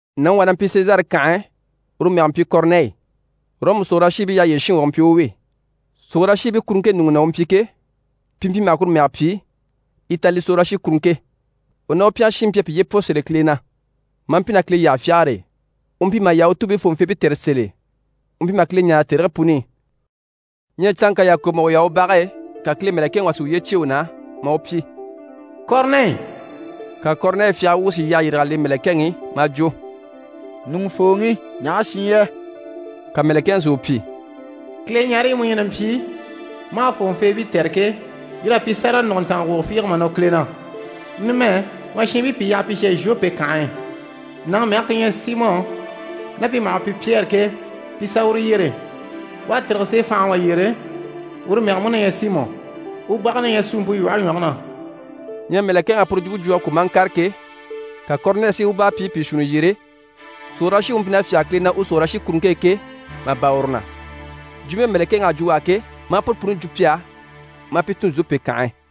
Nàŋi wà na mpyi Sezare kànhe e, uru mɛge mpyi Kɔrinɛyi. Ɔrɔmu sòrolashiibii yyaha yyére shinŋi wà u mpyi u wi. Sòrolashiibii kuruŋke ɲùŋɔ na u mpyi ke, pi mpyi maha kuru mɛge pyi Itali sòrolashikuruŋke. U ná u pyɛngɛ shiinbii mpyi a piye pwɔ sèl'e Kile na, maa mpyi ná Kile yyaha fyagare e. U mpyi maha Yahutuubii fòŋɔfeebii tɛ̀re sèl'e, u mpyi maha Kile ɲáare tèrigii puni i. Ɲyɛ canŋka yàkoŋɔ, mà u yaha u bage e, ka Kile mɛ̀lɛkɛŋi wà si uye cyêe u na, maa u pyi: «Kɔrinɛyi!» Ka Kɔrinɛyi fyagara wuŋi si yyahe yîrig'a le mɛ̀lɛkɛŋi i, maa jwo: «Ɲùŋufooŋi, ɲaha shi yɛ?» Ka mɛ̀lɛkɛŋi si u pyi: «Kileɲareyi mu ɲyɛ na mpyi, maa fòŋɔfeebii tɛ̀re ke, yir'à pyi sáraga nùguntanga wugo fiige mà nɔ Kile na. Numɛ, ma shiinbii pìi yaha pi shà Zhope kànhe e, nàŋi mɛge ku ɲyɛ Simɔ, ná pi maha u pyi Pyɛri ke, pi i sà uru yyere. U à tîrige seefanhaŋi wà yyére, uru mɛge mú na ɲyɛ Simɔ. U bage na ɲyɛ suumpe lwɔhe ɲwɔge na.» Ɲyɛ mɛ̀lɛkɛŋ'à puru jwumpe jwo a kwɔ̀ maa ŋkàre ke, ka Kɔrinɛyi si u báarapyiibii pìi shuunni yyere, sòrolashiŋi u mpyi na fyáge Kile na u sòrolashikuruŋke e ke, mà bâra uru na. Jwumpe mɛ̀lɛkɛŋi à jwo u á ke, maa puru puni jwo pi á, maa pi tun Zhope kànhe e.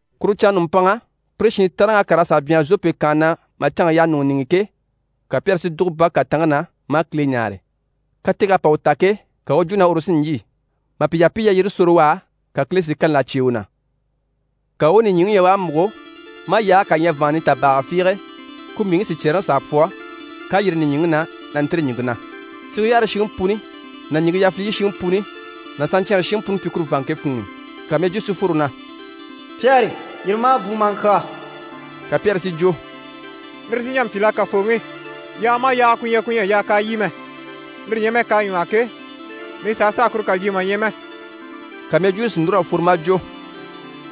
Kuru canŋa nùmpanŋa, pire shiin taanreŋ'à kàr'a sà byanhara Zhope kànhe na mà canŋke yaha ɲùŋɔ niŋi i ke, ka Pyɛri si dùgo bage kàtanŋke na, maa Kile ɲáare. Kateg'à pa u ta ke, ka u u jwo na uru sí n‑lyî. Mà pi yaha pi i yalyire sore u á, ka Kile si kani là cyêe u na. Ka u u nìɲyiŋi ɲya u à múgo, maa yaage kà ɲya vàanŋa nitabaaga fiige, ku mbìiŋkii sicyɛɛreŋi s'à pwɔ, k'à yîri nìɲyiŋi na, na ntîri ɲìŋke na. Sige yaare shiŋi puni ná ɲìŋke yafiliyi shiŋi puni ná saɲcyɛɛnre shiŋi puni mpyi kuru vàanŋke funŋ'i. Ka mɛjwuu si fworo na: «Pyɛri, yîri ma a bùu ma a ŋkyàa.» Ka Pyɛri si jwo: «Lire sí n‑jà n‑pyi la Kafooŋi? Yaaga maha yaaga ku ɲyɛ ku ɲyɛ a yaa k'a lyî mɛ, lire ɲyɛ mɛ k'à ɲwɔ́hɔ ke, mii sàha sàa kuru kà lyî mà ɲya mɛ.» Ka mɛjwuuni si núr'a fworo maa jwo: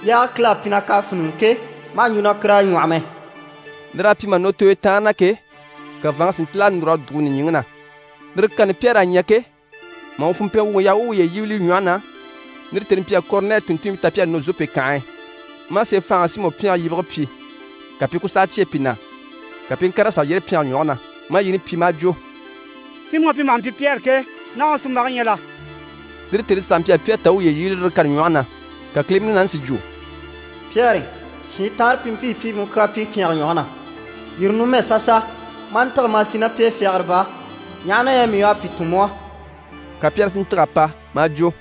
«Yaage Kile à pyi na k'à fíniŋɛ ke, ma hà ɲjwo na kur'à ɲwɔ́hɔ mɛ.» Lir'à pyi mà nɔ tooyo taanre na ke, ka vàanŋke si ntíl'a núr'a dùgo nìɲyiŋi na. Lire kani Pyɛri à ɲya ke, mà u funmpɛn wuŋi yaha u u uye yíbili li ɲwɔhe na, lire tèni mpyi a Kɔrinɛyi tùnntunmpii ta pi à nɔ Zhope kànhe e, maa seefanhaŋi Simɔ pyɛnge yibige pyi, ka pi i ku saha cyêe pi na, ka pi i ŋkàr'a sà yyére pyɛnge ɲwɔge na, maa yini pyi, maa jwo: «Simɔ pi maha mpyi Pyɛri ke, naha u sunmbage ɲyɛ la?» Lire tèni saha mpyi a Pyɛri ta u u uye yíbili lire kani ɲwɔhe na. Ka Kile Munaani si jwo: «Pyɛri, shiin taanre pi mpii pi i mu kyaa pyi pyɛnge ɲwɔge na. Yîri numɛ sasa, ma a ntîge, ma a sì ná pi e fyagara baa, ɲaha na yɛ mii u à pi tun mu á.» Ka Pyɛri si ntîg'a pa, maa jwo: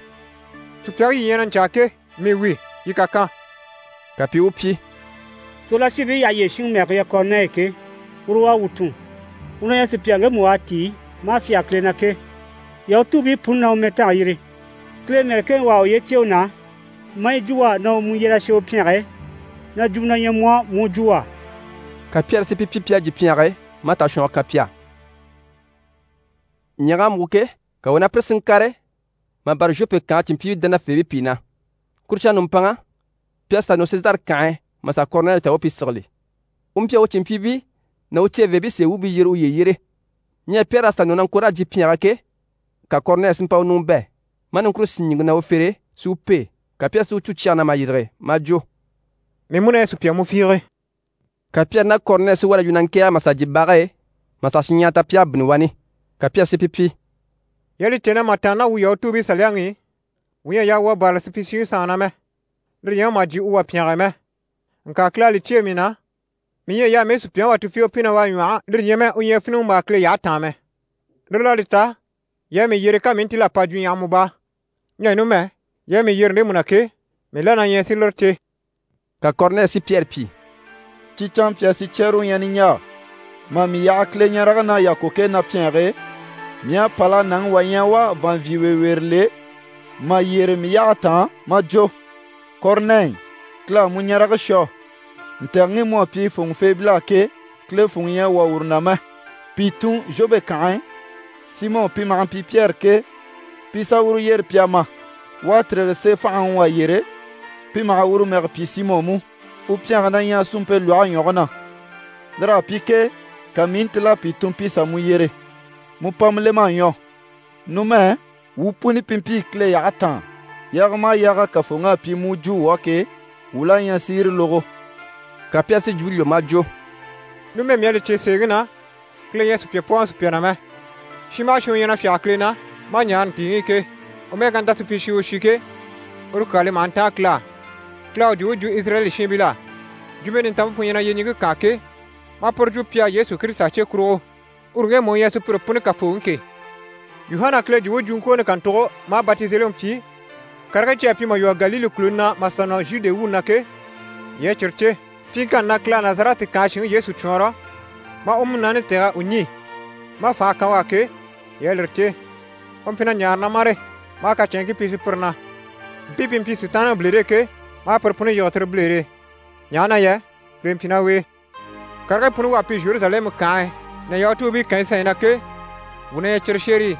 «Sùpyaŋi yii ɲyɛ na ɲcaa ke, mii wi, yii kà kan!» Ka pi i u pyi: «Sòrolashiibii yyaha yyére shinŋi mɛge ku ɲyɛ Kɔrinɛyi ke, uru u à wuu tun. U na ɲyɛ sùpya ŋgemu u à tíi, maa fyáge Kile na ke. Yahutuubii puni na u mɛtange yîri. Kile mɛ̀lɛkɛŋi wà à uye cyêe u na, maa yi jwo u á na u mu yyer'a shà u pyɛnge e, na jwumɔ na ɲyɛ mu á, mu u jwo u á.» Ka Pyɛri si pi pyi pi à jyè pyɛnge e, maa tashwɔngɔ kan pi á. Ɲyɛ̀g'à múgo ke, ka u ná pire si ŋkàre, mà bâra Zhope kànhe cìnmpyiibii dánafeebii pìi na. Kuru canŋa nùmpanŋa, pi à sà nɔ Sezare kànhe e, mà sà Kɔrinɛyi ta u u pi sigili. U mpyi a u cìnmpyiibii ná u ceveebii sèe wuubii yyere uye yyére. Ɲyɛ Pyɛri à sà nɔ na ŋko raa jyè pyɛnge e ke, ka Kɔrinɛyi si mpa u ɲùŋɔ bɛ̂, maa niŋkure sín ɲìŋke na u fere e, si u pêe. Ka Pyɛri si u cû cyɛge na mà yîrige, maa jwo: «Mii mú na ɲyɛ sùpya mu fiige!» Ka Pyɛri ná Kɔrinɛyi si wá na yu na ŋkɛ̀ɛge mà sà jyè bage e, mà sà shinɲyahara ta pi à bínni wani. Ka Pyɛri si pi pyi: «Yii à li cè na mà tàanna ná wuu Yahutuubii saliyaŋi i, wuu ɲyɛ a yaa wuu a bârali supyishiŋi sanŋi na mɛ, lire ɲyɛ mɛ mà jyè u wà pyɛnge e mɛ. Ŋka Kile à li cyêe mii na na mii ɲyɛ a yaa mii u sùpyaŋi wà tufiige pyi na u à ɲwɔ́hɔ, lire ɲyɛ mɛ u ɲyɛ fíniŋimbaa Kile yyahe taan mɛ. Lire l'à li ta, yii à mii yyere, ka mii i ntíl'a pa jwuɲyahama baa. Ɲyɛ numɛ, yii à mii yyere ndemu na ke, mii la na ɲyɛ si lire cè.» Ka Kɔrinɛyi si Pyɛri pyi: «Cyi canmpyaa sicyɛɛre u ɲyɛ niɲjaa, mà mii yaha Kileɲarege na yàkoŋke na pyɛnge e, mii à pâl'a nàŋi wà ɲya u à vàanvyinweeweere le mà yyére mii yyahe taan, maa jwo “Kɔrinɛyi, Kile à mu ɲarege shwɔ, ntɛ̀gɛŋi mu à pyi fòŋɔfeebil'á ke, Kile funŋɔ ɲyɛ a wwɔ̀ uru na mɛ. Pìi tun Zhope kànhe e, Simɔ pi maha mpyi Pyɛri ke, pi i sà uru yyere pi a ma. U à tîrige seefanhaŋi wà yyére, pi maha uru mɛge pyi Simɔ mú. U pyɛnge na ɲyɛ suumpe lwɔhe ɲwɔge na.” Lir'à pyi ke, ka mii i ntíl'a pìi tun pi sà mu yyere. Mu pama lem'à ɲwɔ. Numɛ, wuu puni pi mpii Kile yyahe taan, yaaga maha yaaga Kafooŋi à pyi mu u jwo wuu á ke, wuu la ɲyɛ si yire lógo.» Ka Pyɛri si jwumpe lwɔ́ maa jwo: «Numɛ mii à li cè sèeŋi na, Kile ɲyɛ a sùpya pwɔ́ɔŋɔ sùpya na mɛ. Shin maha shin u ɲyɛ na fyáge Kile na, maa ɲaare ntìiŋi i ke, u mɛ́ɛ ká nta supyishi o shi ke, uru kyaa li maha ntáan Kile á. Kile à u jwumpe jwo Izirayɛli shiinbil'á. Jwumpe Nintanmpe pu ɲyɛ na yyeɲiŋke kaan ke, maa puru jwo pi á Yesu Kirisita cye kurugo, uru ŋgemu u ɲyɛ sùpyire puni Kafooŋi ke. Yuhana Kile jwumpe jwuŋkwooni kàntugo maa batizeliŋi pyi, karigii cyi à pyi mà lwɔ́ Galile kùluni na, mà sà nɔ Zhude wuuni na ke, yii à cyire cè. Pyiŋkanni na Kile à Nazarɛti kànhe shinŋi Yesu cwɔɔnrɔ, maa u Munaani tɛ̀g'a u ɲî, maa fànha kan u á ke, yii à lire cè. U mpyi na ɲaare na mâre, maa kacɛnŋkii pyi sùpyire na. Mpii pi mpyi Sitaanniŋi bilere e ke, maa pire puni yige tire bilere e, ɲaha na yɛ Kile mpyi ná u e. Karigii puni u à pyi Zheruzalɛmu kànhe ná Yahutuubii kànyi sanɲyi na ke, wuu na ɲyɛ cyire shérii.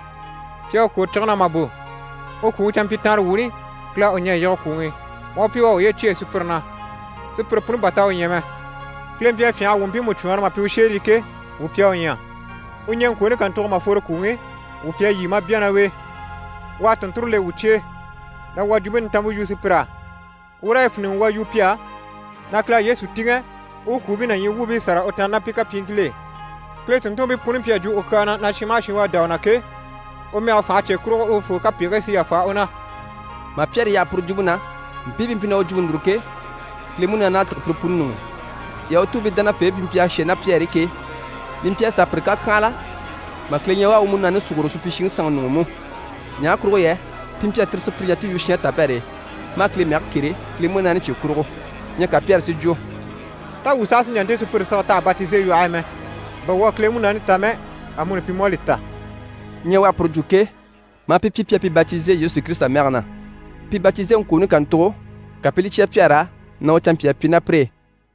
Pi à u kwòro cige na mà bò. U kwùŋi canmpyitanrewuuni, Kile à u ɲɛ̀ a yige kwùŋi i, maa u pyi u à uye cyêe sùpyire na. Sùpyire puni bà t'à u ɲya mɛ. Kile mpyi a fyânha a wuu mpiimu cwɔɔnrɔ mà pyi u shérii ke, wuu pi à u ɲya. U ɲɛŋkwooni kàntugo mà fworo kwùŋi i, wuu pi à lyî maa bya ná u e. U à tùnnture le wuu cye e, na wuu a Jwumpe Nintanmpe yu sùpyir'á, wuu raa yi fíniŋi wuu a yu pi á, na Kile à Yesu tìŋɛ u u kwùubii ná ɲyii wuubii sâra u tàanna ná pi kapyiiŋkil'e. Kile tùnntunmpii puni mpyi a jwo u kyaa na na shin maha shin u à dá u na ke, u mɛge fànhe cye kurugo, urufoo kapegigii sí yàfa u na.» Mà Pyɛri yaha puru jwumpe na, mpii pi mpyi na u jwumpe núru ke, Kile Munaani à tîge pire puni ɲuŋ'i. Yahutuubii dánafeebii pi mpyi a shà ná Pyɛri e ke, li mpyi a sàa pire kàkyanhala mà Kile ɲya u à u Munaani sùguro supyishiŋi sanŋi ɲuŋ'i mú. Ɲaha kurugo yɛ pi mpyi a tire sùpyire ɲya ti i yu shɛɛnre tabɛr'e, maa Kile mɛge kêre Kile Munaani cye kurugo. Ɲyɛ ka Pyɛri si jwo: «Tá wuu saha sí n‑jà nte sùpyire sige t'àha batize lwɔhe e mɛ? Bà wuu à Kile Munaani ta mɛ, amuni pi mú à li ta.» Ɲyɛ u à puru jwo ke, maa pi pyi pi à pi batize Yesu Kirisita mɛge na. Pi batizeŋkwooni kàntugo, ka pi i li cya Pyɛri á na u canmpyaa pyi ná pire e.